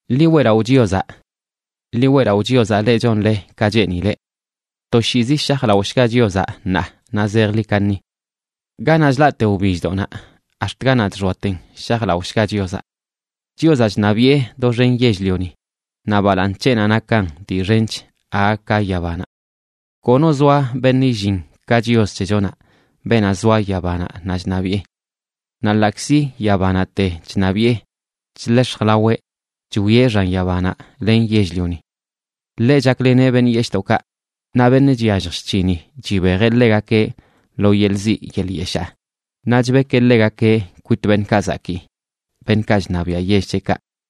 ¡Ḻi weꞌlaꞌo Chiozaꞌ! Ḻi weꞌlaꞌo Chiozaꞌ, leꞌ chonle ka cheenileꞌ. Toshiizi shajlaꞌoshga Chiozaꞌ, ṉaa naꞌ zejḻi kaṉi. Ganaꞌ chlaꞌte wbilldoꞌnaꞌ ax̱t ganaꞌ chxoaten, shajlaꞌoshga Chiozaꞌ. Chiozaꞌ chṉabiꞌe doxen yell-lioni, naꞌ balaaṉ c̱heꞌnaꞌ nakan dii xench aga ka yabanaꞌ. Kono zoa beṉꞌ illin ka Chios c̱hechonaꞌ, beenaꞌ zoa yabanaꞌ naꞌ chṉabiꞌe. Naꞌ ḻaꞌkzi yabanaꞌte chṉabiꞌe, chḻex̱j laweꞌ chwieꞌ xan yabanaꞌ len yell-lioni. Ḻeꞌ chakleneꞌ beṉꞌ yeshꞌdoꞌkaꞌ, naꞌ beṉꞌ chyallj chc̱hini chibejeꞌ ḻegakeꞌ lo yeḻꞌ ziꞌ yeḻꞌ yeshaa, naꞌ chbekeꞌ ḻegakeꞌ kwit beṉꞌkaꞌ zakii, beṉꞌkaꞌ chṉabiaꞌ yell c̱heꞌkaꞌ.